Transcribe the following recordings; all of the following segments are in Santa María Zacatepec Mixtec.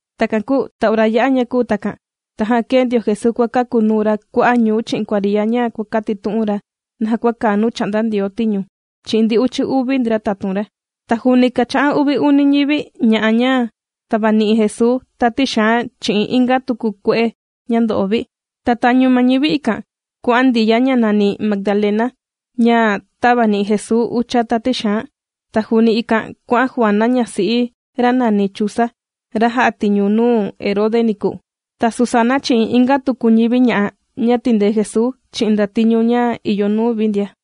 Takan kūu ta ora yā'a ña kūu takan, tajan kēe ndio Jesuu kuàkakunuu ra kua'a' ñuu chi'in kuariya ña kuàkatitu'un ra naja kua kàa nuu chà'nda Ndioo tiñu, chi'in ndi uchi uvi ndra tatun ra. Ta juuni kàcha'an uvi uni ñivi ña'a ña tàvani'i Jesuu tati xaan chi'in inga tuku kue'e ña ndo'o vi. Ta tañu ma ñivi ikan, kuà'an Ndiya, ña nàni Magdalena, ña tāvani'i Jesuu ucha tati xaan, ta juuni ikan kuà'an Juana ñasi'i ra nàni Chuza, ra jā'a tiñu nuu Herode niku, ta Susana chi'in inga tuku ñivi ña'a ña tìndee Jesuu chi'in ndatiñu ña ìyo nuu vi ndia.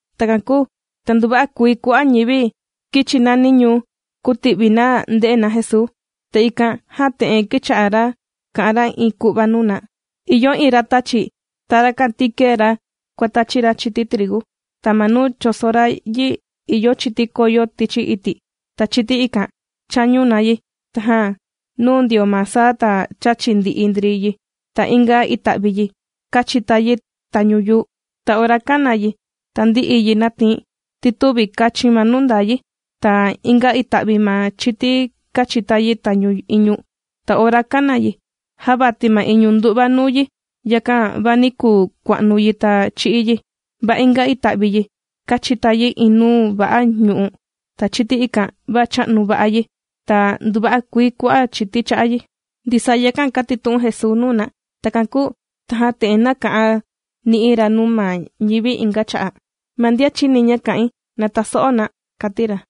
Takan kūu ta nduva'a kuii kua'a' ñivi kīchi nani ñuu kūti'vi na nde'e na Jesuu. Ta ikan jan te'en kīcha'a ra kà'an ra iin ku'va nuu na: ―Ìyo iin ratàchi. Ta rakan ti kēe ra kuàtachi ra chiti trigu. Ta ma nuu chōso ra yi ìyo chiti kōyo tichi iti'. Ta chiti ikan chāñu na yi, tajan nūu ndio ma saa ta chāchi ndi'i ndri yi. Ta inga ita'vi yi kāchita yi tañu yuu. Ta ora kāna yi ta ndī'i yi nàtii ti tüvi kàchin ma nuu ndaa yi. Ta inga ita'vi ma chiti kāchita yi tañu iñu, ta ora kāna yi, jāvati ma iñu ndu'va nuu yi, yakan va nī kuu kua'nu yi ta chī'í yi. Va inga ita'vi yi kāchita yi iin nuu va'a ñu'u' ta chiti ikan va chā'nu va'a yi ta nduva'a kuii kua'a' chiti chā'a yi. Ndisaa yakan kātitu'un Jesuu nuu na. Takan kūu tajan te'en nāka'an ni'i ra nuu ma ñivi inga cha'a': ―¡Ma ndian chìni ña kà'in na taso'o na! ―kàti ra.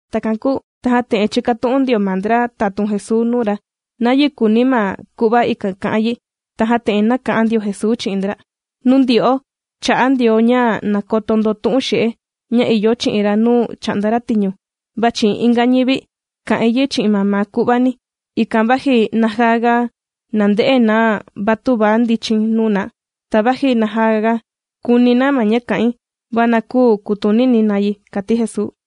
Takan kūu tajan te'en chīkatu'un ndio ma ndra tatun Jesuu nuu ra nayi kùuni ma ku'va ikan ka'an yi. Tajan te'en nāka'an ndio Jesuu chi'in ndra: ―Nuu ndyo'o, chà'a Ndioo ña na koto ndo tu'un xe'e ña ìyo chi'in ra nuu chà'nda ra tiñu, va chi'in inga ñivi kà'in yi chi'in mamaa ku'vani, ikan vaji najaga nande'e na va tüvi ndichin nuu na, ta vaji najaga kuni na ma ña kà'in, va na küu kutunini na yi ―kàti Jesuu.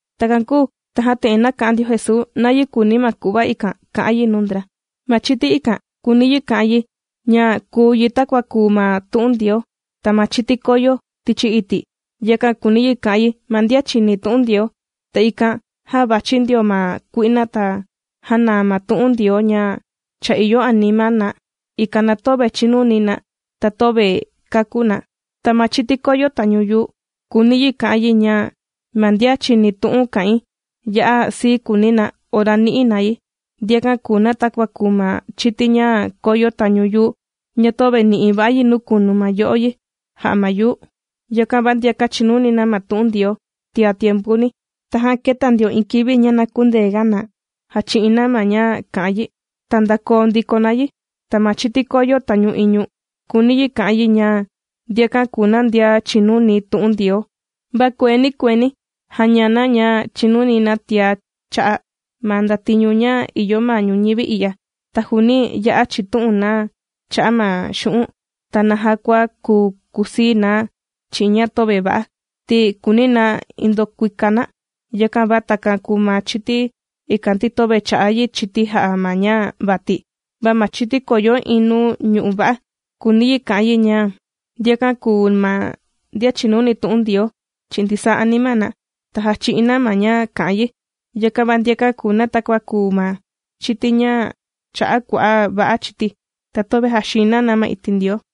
Takan kūu tajan te'en nāka'an ndio Jesuu nayi kùuni ma ku'va ikan ka'an yi nuu ndra: ―Ma chiti ikan kùuni yi ka'an yi ña kùu yi takua kùu ma tu'un Ndioo. Ta ma chiti kōyo tichi iti', yakan kùuni yi ka'an yi ma ndian chìni tu'un Ndioo. Ta ikan jan vàchi ndio ma kui'na ta jànaa ma tu'un Ndioo ña cha ìyo anima na, ikan na töve chìnuni na ta töve kàkú na. Ta ma chiti kōyo tañu yuu kùuni yi ka'an yi ña ma ndian chìni tu'un kà'in ya'a sii kùuni na ora nì'i na yi. Ndiakan kùu na takua kùu ma chiti ña kōyo tañu yuu ña töve nì'i va'a yi nuu kunu ma yo'o yi jà'a ma yuu. Yakan va ndiakan chìnuni na ma tu'un Ndioo tia tiempuni. Tajan kēta ndio iin kivi ña na kündeega na jachi'in na ma ña kà'an yi, ta ndākoo ndiko na yi. Ta ma chiti kōyo tañu iñu, kùuni yi ka'an yi ña ndiakan kùu ma ndian chìnuni tu'un Ndioo. Va kueeni kueeni jàña na ña chìnuni na tiá cha'a' ma ndatiñu ña ìyo ma ñuñivi i'ya, ta juuni ya'a chìtu'un na cha'a' ma xu'un' ta naja kua kuu kakusii na chi'in ña töve va'a, ti kùuni na ndokuika na. Yakan va takan kùu ma chiti ikan, ti töve chā'a yi chiti jā'a ma ña vati. Va ma chiti kōyo iin nuu ñu'u' va'a, kùuni yi kà'an yi ña ndiakan kùu ma ndian chìnuni tu'un Ndioo chi'in ndisaa anima na, ta jàchi'in na ma ña kà'an yi. Yakan va ndiakan kùu na takua kùu ma chiti ña chā'a kua'a' va'a chiti, ta töve jàxiin na na ma iti' Ndioo.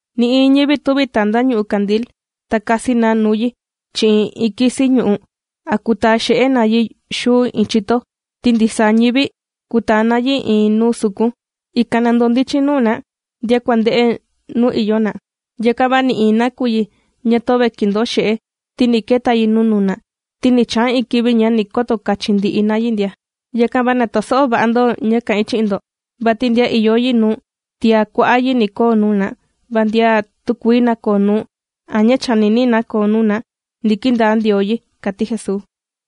’Nï'iin ñivi tüvi taa na ñu'ú kandil ta kasi na nuu yi chi'in iin kisi ñu'u' a kutaa xe'e na yi xuu iin chito, ti ndisaa ñivi kùtaa na yi iin nuu sukun, ikan na ndondichin nuu na ndian kuànde'e nuu ìyo na. Yakan va nï'iin nakuyi ña töve kìndoo xe'e, ti ni keta yi nuu nuna, ta ni chaa iin kivi ña ni koto kachin ndi'i na yi ndia. ’Yakan va na taso'o va'a ndo ña kà'in chi'in ndo. Vati ndian ìyo yi nuu, tiá kua'a' yi ni koo nuu na. Va ndian tükuii nakoo nuu, a ña chànini na koo nuu na, ni kindaa Ndioo yi ―kàti Jesuu.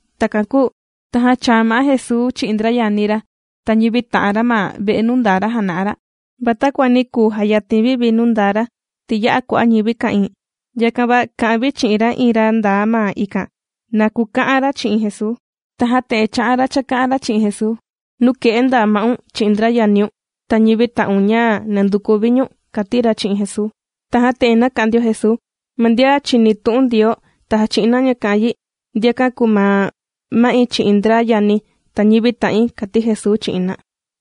Takan kūu tajan chāa ma'á Jesuu chi'in ndra yani ra ta ñivi ta'an ra ma ve'e nuu ndaa ra jàna'a ra. Va takua nī kuu jayatin vi vi nuu ndaa ra, ti ya'a kua'a' ñivi ka'ìin. Yakan va kà'an vi chi'in iin ra ndaa ma ikan, na kuka'an ra chi'in Jesuu. Tajan te'en chā'an ra chāka'an ra chi'in Jesuu: ―Nuke'e ndaa ma'un chi'in ndra yaniun ta ñivi ta'un ña nànduku vi ñu̱n ―kàti ra chi'in Jesuu. Tajan te'en nāka'an ndio Jesuu: ―Ma ndian chìni tu'un Ndioo ta jàchi'in na ña kà'an yi, ndiakan kùu ma ma'i chi'in ndra yani̱ ta ñivi ta'in ―kàti Jesuu chi'in na.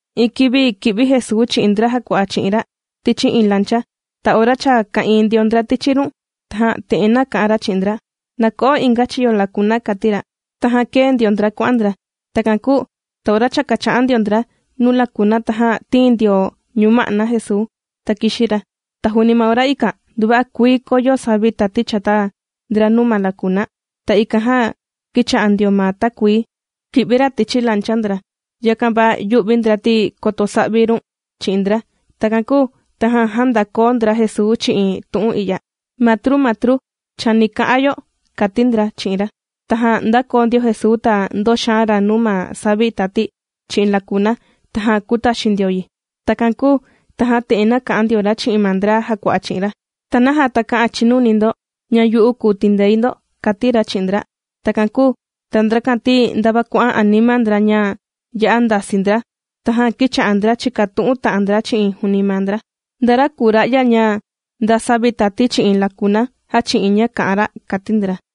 Iin kivi kī'vi Jesuu chi'in ndra jàkua'a chi'in ra tichi iin lancha. Ta ora cha ka'ìin ndio ndra tichi run, tajan te'en nāka'an ra chi'in ndra: ―Na ko'o inga chiyo lakuna ―kàti ra. Tajan kēe ndio ndra kuà'an ndra. Takan kūu ta ora cha kàcha'an ndio ndra nuu lakuna tajan tīin ndio ñuma'na Jesuu, ta kīxi ra. Ta juuni ma ora ikan nduva'a kuii kōyo savi tati chata ndra nuu ma lakuna. Ta ikan jan kīcha'a ndio ma takuii kì'vi ra tichi lancha ndra. Yakan va yū'vi ndra ti koto sa'vi run chi'in ndra. Takan kūu tajan jāndakoo ndra Jesuu chi'in tu'un i'ya: ―¡Matru! ¡Matru! Chani ka'a yo ―kàti ndra chi'in ra. Tajan ndākoo ndio Jesuu ta ndōxaan ra nuu ma savi tati chi'in lakuna, tajan kūtaxin ndio yi. Takan kūu tajan te'en nāka'an ndio ra chi'in ma ndra jàkua'a chi'in ra: ―¿Ta naja takä'an chinuni ndo ña yu'u kùu tindei ndo? ―kàti ra chi'in ndra. Takan kūu ta ndrakan ti ndava kuà'an anima ndra ña ya'a ndasii ndra. Tajan kīcha'a ndra chìkatu'un ta'an ndra chi'in juuni maa ndra: ―¿Nda ra kùu ra'ya ña nda savi tati chi'in lakuna jàchi'in ña kà'an ra? ―kàti ndra.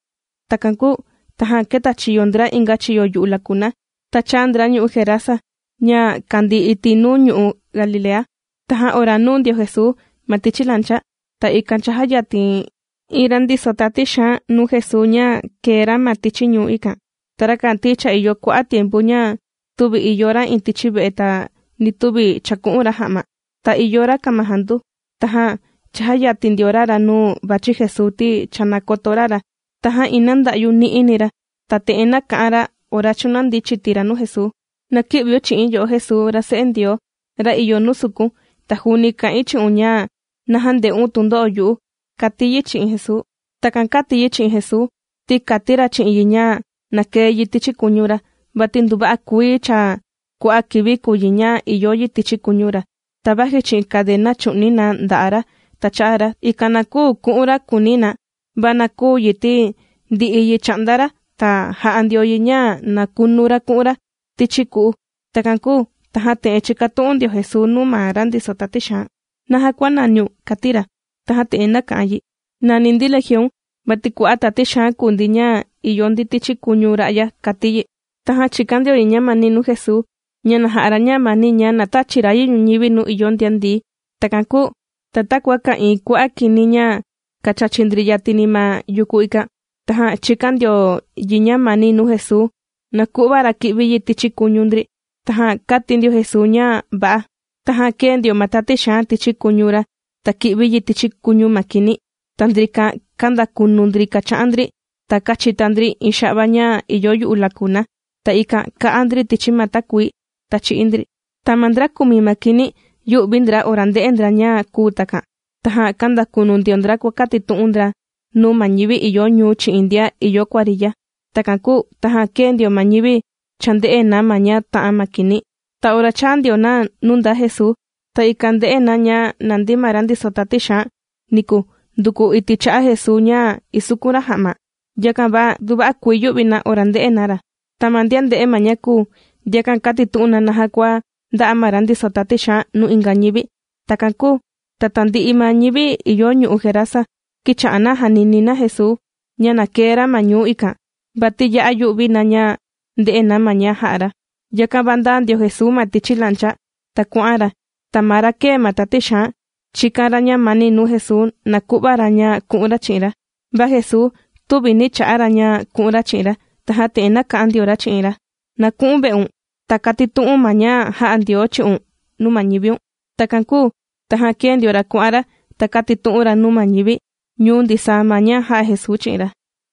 Takan kūu tajan kētachiyo ndra inga chiyo yu'u lakuna, ta chāa ndra ñu'u' Gerasa ña kàndii iti' nuu ñu'u' Galilea. Tajan ora nūu ndio Jesuu ma tichi lancha, ta ikan cha jāyatin iin ra ndiso tati xaan nuu Jesuu ña kēe ra ma tichi ñuu ikan. Ta rakan ti cha ìyo kua'a' tiempu ña tüvi ìyo ra iin tichi ve'e ta ni tüvi chàku'un ra ja'ma. Ta ìyo ra kamajandu. Tajan chājayatin ndio ra ra nuu vàchi Jesuu, ti cha nākoto ra ra, tajan iin nanda'yu ni'i ni ra, ta te'en nāka'an ra ora chūnandi chiti ra nuu Jesuu: ―¡Na kï'viun chi'i̱n, yo'o Jesuu ra Se'e Ndioo ra ìyo nuu sukun! Ta juuni kà'in chi'un ña na jände'un tundo'o yu'u ―kàti yi chi'in Jesuu. Takan kāti yi chi'in Jesuu ti kāti ra chi'in yi ña na kee yi tichi kuñu ra. Vati nduva'a kuii cha kua'a' kivi kùu yi ña ìyo yi tichi kuñu ra, ta vaji chi'in karena chù'ni na nda'a' ra ta cha'a ra, ikan na küu ku'un ra, kùuni na, va na küu yi ti ndì'i yi chà'nda ra ta jà'a ndio yi ña na kunu ra ku'un ra tichi ku'u. Takan kūu, tajan te'en chìkatu'un ndio Jesuu nuu ma ra ndiso tati xaan: ―¿Naja kuànaniun? ―kàti ra. Tajan te'en nāka'an yi: ―Nàni ndi Legion, vati kua'a' tati xaan kùu ndi ña ìyo ndi tichi kuñu ra'ya ―kàti yi. Tajan chīkan ndio yi ñamani nuu Jesuu ña na ja'a ra ñamani ña na tächi ra yi ñuñivi nuu ìyo ndian ndií. Takan kūu ta takua ka'ìin kua'a' kini ña kàchachi ndri yatini ma yuku ikan, tajan chīkan ndio yi ñamani nuu Jesuu na ku'va ra ki'vi yi tichi kuñu ndri. Tajan kāti ndio Jesuu ña va'a. Tajan kēe ndio ma tati xaan tichi kuñu ra, ta kī'vi yi tichi kuñu ma kini. Ta ndrikan kāndakunu ndri kàcha'an ndri ta kàchita ndri iin xa'va ña ìyo yu'u lakuna. Ta ikan kā'a ndri tichi ma takuii, ta chī'í ndri. Ta ma ndra kùmi ma kini, yū'vi ndra ora ndē'e ndra ña kūu takan, tajan kāndakunu ndio ndra kuàkatitu'un ndra nuu ma ñivi ìyo ñuu chi'in ndian ìyo kuariya. Takan kūu tajan kēe ndio ma ñivi chānde'e na ma ña tā'an ma kini. Ta ora chāa ndio na nuu ndaa Jesuu, ta ikan ndē'e na ña nàndi ma ra ndiso tati xaan niku nduku iti' cha'a Jesuu ña isukun ra ja'ma. Yakan va nduva'a kuii yū'vi na ora ndē'e na ra. Ta ma ndian ndē'e ma ña kūu, ndiakan kātitu'un na naja kua ndā'a ma ra ndiso tati xaan nuu inga ñivi. Takan kūu ta tandi'i ma ñivi ìyo ñu'u' Gerasa, kīcha'a na jànini na Jesuu ña na kee ra ma ñu'u' ikan, vati ya'a yū'vi na ña ndè'e na ma ña jā'a ra. Yakan va ndāa ndio Jesuu ma tichi lancha ta kuà'an ra. Ta ma ra kēe ma tati xaan chīkan ra ñamani nuu Jesuu, na ku'va ra ña ku'un ra chi'in ra. Va Jesuu tüvi nī cha'a ra ña ku'un ra chi'in ra. Tajan te'en nāka'an ndio ra chi'in ra: ―Na ku'u̱n ve'un, ta katitu'u̱n ma ña jā'a Ndioo chi'un nuu ma ñiviun. Takan kūu tajan kēe ndio ra kuà'an ra, ta kātitu'un ra nuu ma ñivi ñuu ndisaa ma ña jā'a Jesuu chi'in ra.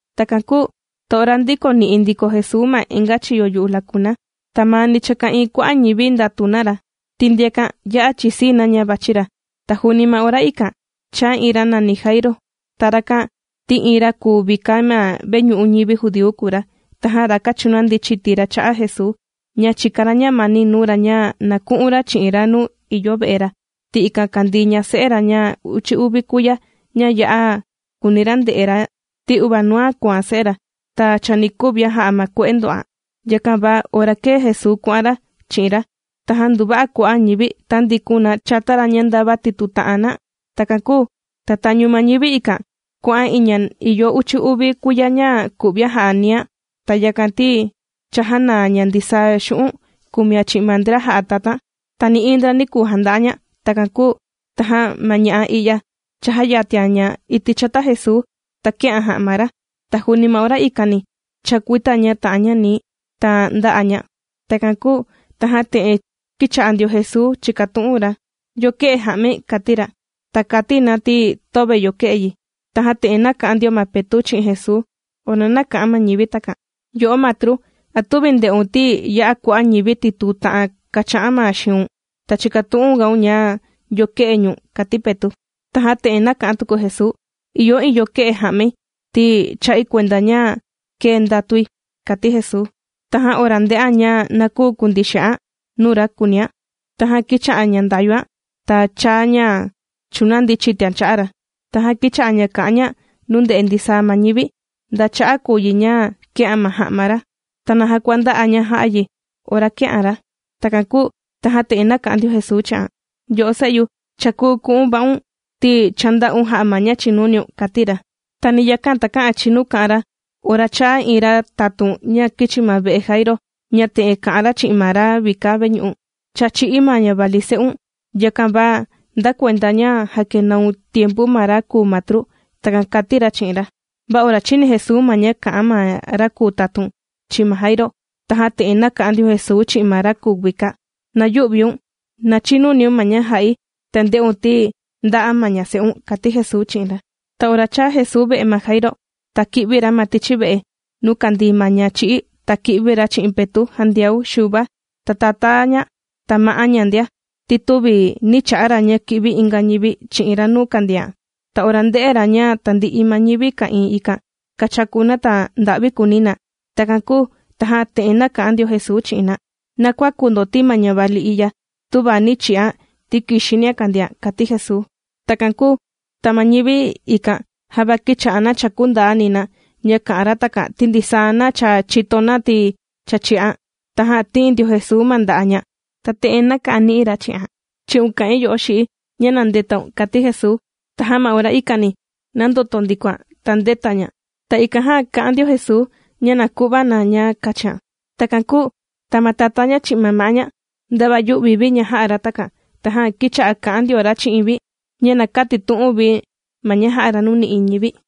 Takan kūu ta ora ndīkoni'i ndiko Jesuu ma inga chiyo yu'u lakuna, ta maani cha ka'ìin kua'a' ñivi ndàtu na ra. Ti ndiakan ya'a chìsii na ña vàchi ra. Ta juuni ma ora ikan, chāa iin ra nàni Jairo. Ta rakan ti iin ra kùu vika ma veñu'u ñivi judíu kùu ra. Tajan rakan chūnandi chiti ra cha'a Jesuu ña chìkan ra ñamani nuu ra, ña na ku'un ra chi'in ra nuu ìyo ve'e ra, ti ikan kàndii ñase'e ra ña uchi uvi kuiya, ña ya'a kùuni ra nde'e ra, ti uvaa nuan kùan se'e ra, ña chani kuvian jà'a ma kue'e ndò'an. Yakan va ora kēe Jesuu kuà'an ra chi'in ra, tajan nduva'a kua'a' ñivi tāndikun na chata ra ña ndava tìtuu ta'an na. Takan kūu ta tañu ma ñivi ikan, kuà'an iin ña cha ìyo uchi uvi kuiya ña ku'vian jà'a niian. Ta yakan ti cha jānaa ña ndisaa xu'un' kùmian chi'in ma ndra jà'a tatan. Ta nï'iin ndra nī kuu janda'a ña. Takan kūu tajan ma ña'a i'ya chājayatian ña iti' chata Jesuu, ta kē'an ja'ma ra, ta juuni ma ora ikani chākuita ña ta'an ña nii, ta ndā'a ña. Takan kūu tajan te'en kīcha'a ndio Jesuu chìkatu'un ra: ―¿Yo kē'e ja'mai? ―kàti ra. Ta kàti na ti töve yo kē'e yi. Tajan te'en nāka'an ndio ma Petu' chi'in Jesuu ora nāka'an ma ñivi takan: ―Yo'o Matru, ¿a tüvi ndè'un ti ya'a kua'a' ñivi tìtuu ta'an kàcha'an na xiun? ¿Ta chīkatu'un gaun ña yo kē'e ñu̱n? ―kàti Petu'. Tajan te'en nāka'an tuku Jesuu: ―Ìyo iin yo kē'e ja'mai ti chā'i kuenda ña kēe ndatui ―kàti Jesuu. Tajan ora ndē'an ña na küu kundii xe'an nuu ra kùunian, tajan kīcha'a ña ndayuan ta chāa ña chūnandi chitian cha'a ra. Tajan kīcha'a ña kà'an ña nuu ndè'e ndisaa ma ñivi nda cha'a' kùu yi ña kē'an ma ja'ma ra ta naja kua ndā'a ña jā'a yi ora kē'an ra. Takan kūu tajan te'en nāka'an ndio Jesuu chi'an: ―Yo'o se'yu, cha kùu ku'un va'un ti cha ndā'un jā'a ma ña chìnuniun ―kàti ra. Ta ni yakan takä'an chinu kà'an ra ora chāa iin ra tatun ña kīchi ma ve'e Jairo, ña te'en kà'an ra chi'in ma ra vika veñu'u: ―Cha chī'í ma ñavali se'un, yakan va nda kuenda ña jàkenaun tiempu ma ra kùu matru. ―Takan kàti ra chi'in ra. Va ora chīni Jesuu ma ña kā'an ma ra kùu tatun chi'in ma Jairo, tajan te'en nāka'an ndio Jesuu chi'in ma ra kùu vika: ―¡Na yü'viun! Na chinuniun ma ña jà'i ta nde'un ti ndà'a ma ñase'un ―kàti Jesuu chi'in ra. Ta ora chāa Jesuu ve'e ma Jairo, ta kī'vi ra ma tichi ve'e nuu kàndii ma ñachī'í ta kī'vi ra chi'in Petu', Jandiau, Xuva, ta tatá ña ta ma'á ña ndia, ti tüvi nī cha'a ra ña ki'vi inga ñivi chi'in ra nuu kàndian. Ta ora ndē'e ra ña tandi'i ma ñivi ka'ìin ikan kàchaku na ta nda'vi kùuni na. Takan kūu tajan te'en nāka'an ndio Jesuu chi'in na: ―Na kuäku ndo ti ma ñavali i'ya tüvi nī chi'an ti kìxinian kàndian ―kàti Jesuu. Takan kūu ta ma ñivi ikan java kīcha'a na chàkú ndaani na ña kà'an ra takan, ti ndisaa na cha chìto na ti cha chī'an. Tajan tīin ndio Jesuu ma nda'a' ña, ta te'en nāka'an ni'i ra chi'an: ―¡Chi'un kà'in yo'o xi'i ña na ndetaun! ―kàti Jesuu. Tajan ma ora ikani nāndoto ndikoan ta ndēta ña. Ta ikan jan kà'an ndio Jesuu ña na ku'va na ña kachian. Takan kūu ta ma tatá ña chi'in ma'á ña ndava yū'vi vi ña jā'a ra takan, tajan kīcha'a kà'an ndio ra chi'in vi ña na kätitu'un vi ma ña jā'a ra nuu nï'iin ñivi.